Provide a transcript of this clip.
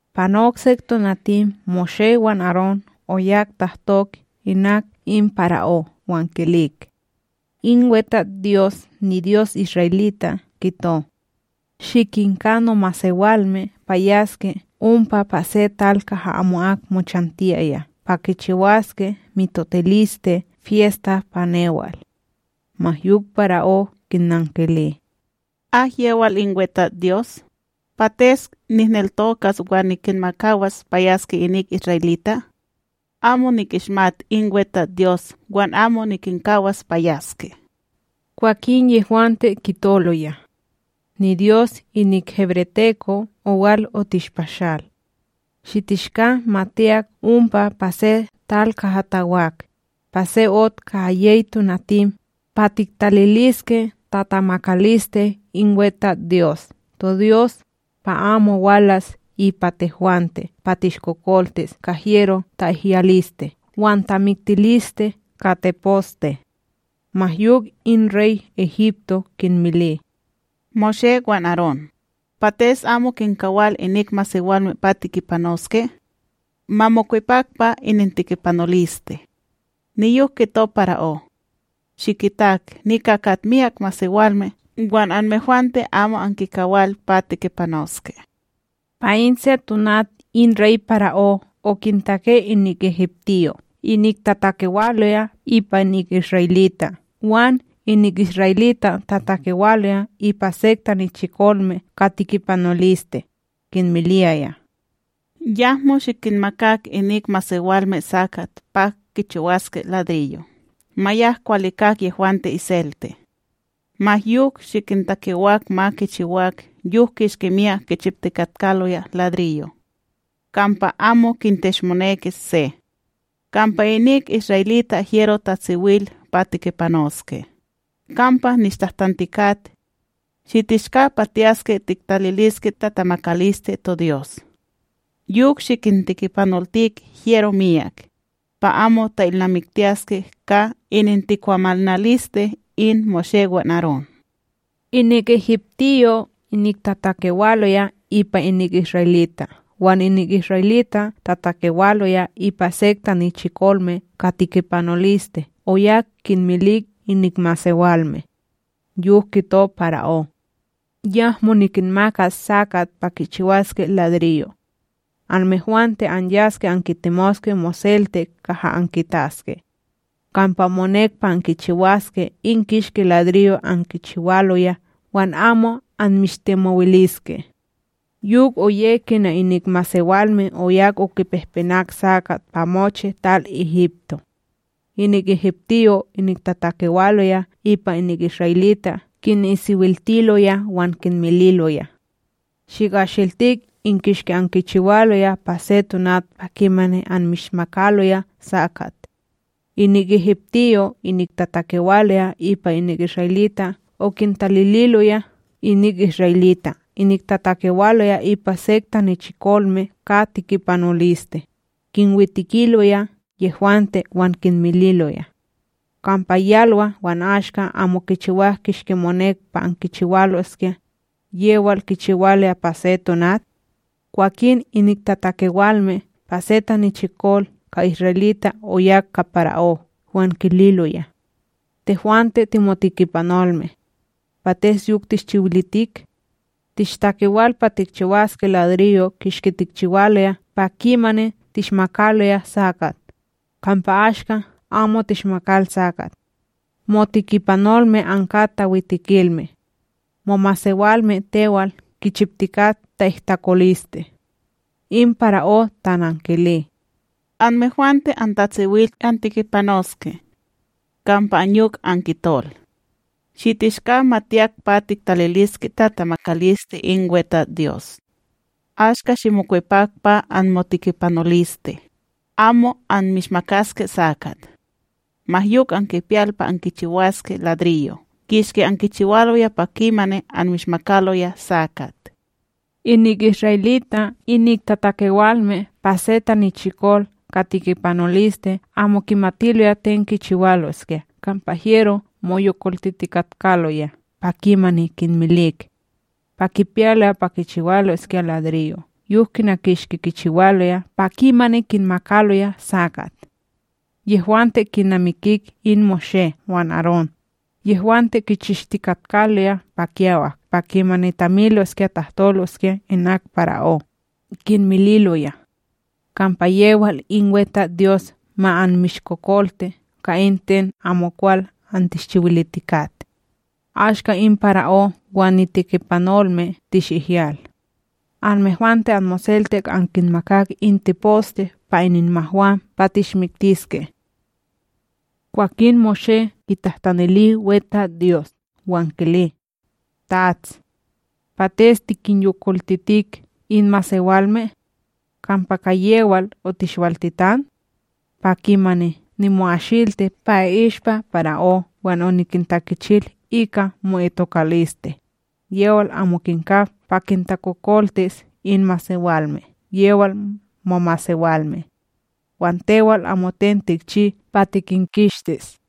Panok sek tonatim Moshé wan Arón oyak tahtok inak in para'ó wan kilik: ―In WeTatsDyos, niDyos isra'elita' kito: “Shikinka nomasewalme pa yaske ompa pa se tal kaha amo'ak mochantiyaya pa kichiwaske mitotiliste fyesta pa newal.” Ma yok para'ó kinnankili: ―Akyewal in WeTatsDyos, pates nihneltokas wan nikinmakawas pa yaske inik isra'elita'? Amo nikishmat in WeTatsDyos wan amo nikinkawas pa yaske! Kwakin yehwante kitoloya: ―NiDyos inik hebreteko' owal otishpashal. Shitishka ma tiyak ompa pa se tal kaha tawak, pa se ot ka yey tonatim, pa tiktaliliske tatamakaliste in WeTatsDyos toDyos, pa amo walas ipa tehwante pa tishkokoltis ka hyero ta'ihyaliste wan tamiktiliste ka teposte. Ma yok in rey Egipto kinmili: ―Moshé wan Arón, pates amo kinkawal inik masewalme pa tekipanoske? Ma mokwepak pa inintekipanoliste! Niyok kito para'ó: ―Shikitak nika kat myak masewalme wan anmehwante amo ankinkawal pa tekipanoske. Pa in se tonat in rey para'ó okintake inik egiptiyo' inik tatakewaloya ipa inik isra'elita' wan inik isra'elita' tatakewaloya ipa sek tanichikolme ka tekipanoliste, kinmiliyaya: “Yahmo shikinmakak inik masewalme sakat pa kichiwaske ladriyo'. Ma yak kwalikak yehwante iselte! Ma yok shikintakewak ma kichiwak yok kishki myak kichiptikatkaloya ladriyo'. Kampa amo kinteshmonekis se! Kampa inik isra'elita' hyero tatsiwil pa tekipanoske, kampa nishtahtantikat: “Shitishka pa tiyaske tiktaliliske tatamakaliste toDyos.” Yok shikintekipanoltik hyero miyak, pa amo ta'ilnamiktiyaske ka inintikwamanaliste in Moshé wan Arón.’” Inik egiptiyo' inik tatakewaloya ipa inik isra'elita' wan inik isra'elita' tatakewaloya ipa sek tanichikolme ka tekipanoliste oyak kinmilik inik masewalme: “Yok kito para'ó: ‘Yahmo nikinmakas sakat pa kichiwaske ladriyo'. Anmehwante anyaske ankitemoske moselte kaha ankitaske! Kampa monek pa ankichiwaske in kishki ladriyo' ankichiwaloya wan amo anmishtimowiliske!’” Yok oye kina inik masewalme oyak okipehpenak sakat pa mochi tal Egipto. Inik egiptiyo' inik tatakewaloya ipa inik isra'elita' kinisiwiltiloya wan kinmililoya: “Shikasiltik in kishki ankichiwaloya pa se tonat pa kimani anmishmakaloya sakat.” Inik egiptiyo' inik tatakewaloya ipa inik isra'elita' okintalililoya inik isra'elita' inik tatakewaloya ipa sek tanichikolme ka tekipanoliste, kinwetikiloya yehwante wan kinmililoya: “Kampa yalwa wan ashka amo ankichiwak kishki monek pa ankichiwaloskya, yewal ankichiwaloya pa se tonat?” Kwakin inik tatakewalme pa se tanichikol ka isra'elita' oyak ka para'ó wan kililoya: ―Tehwante timotekipanolme. Pates yok tishchiwilitik? Tishtakewal pa tikchiwaske ladriyo' kishki tikchiwaloya pa kimani tishmakaloya sakat, kampa ashka amo tishmakal sakat! Motekipanolme ankat tawitekilme! Momasewalme tewal kichiptikat ta'ihtakoliste! In para'ó tanankili: ―Anmehwante antatsiwil antekipanoske! Kampa anyok ankitol: “Shitishka ma tiyak pa tiktaliliske tatamakaliste in WeTatsDyos.” Ashka shimokwepak pa anmotekipanoliste! Amo anmishmakaske sakat, ma yok ankipiyal pa ankichiwaske ladriyo' kishki ankichiwaloya pa kimani anmishmakaloya sakat. Inik isra'elita' inik tatakewalme pa se tanichikol ka tekipanoliste amo kimatiloya ten kichiwaloskya kampa hyero moyolkoltitikatkaloya pa kimani kinmilik pa kipiyaloya pa kichiwaloskya ladriyo' yok kina kishki kichiwaloya pa kimani kinmakaloya sakat. Yehwante kinamikik in Moshé wan Arón, yehwante kichishtikatkaloya pa kiyawak pa kimani tamiloskya tahtoloskya inak para'ó, kinmililoya: “Kampa yewal in WeTatsDyos ma anmishkokolti ka in ten amokwal antishchiwilitikat! Ashka in para'ó wan nitekipanolme tishihyal! Anmehwante anmoselte ankinmakak in teposte pa ininmahwam pa tishmiktiske!” Kwakin Moshé kitahtanili WeTatsDyos wan kili: ―Tats! Pates tikinyokoltitik in masewalme? Kampa ka yewal otishwaltitan? Pa kimani nimo'asilti pa i'ishpa para'ó wan oniktakichil ika mo'itokaliste, yewal amo kinka pa kintakokoltis in masewalme yewal momasewalme. Wan tewal amoten tikchi pa tikinkistis!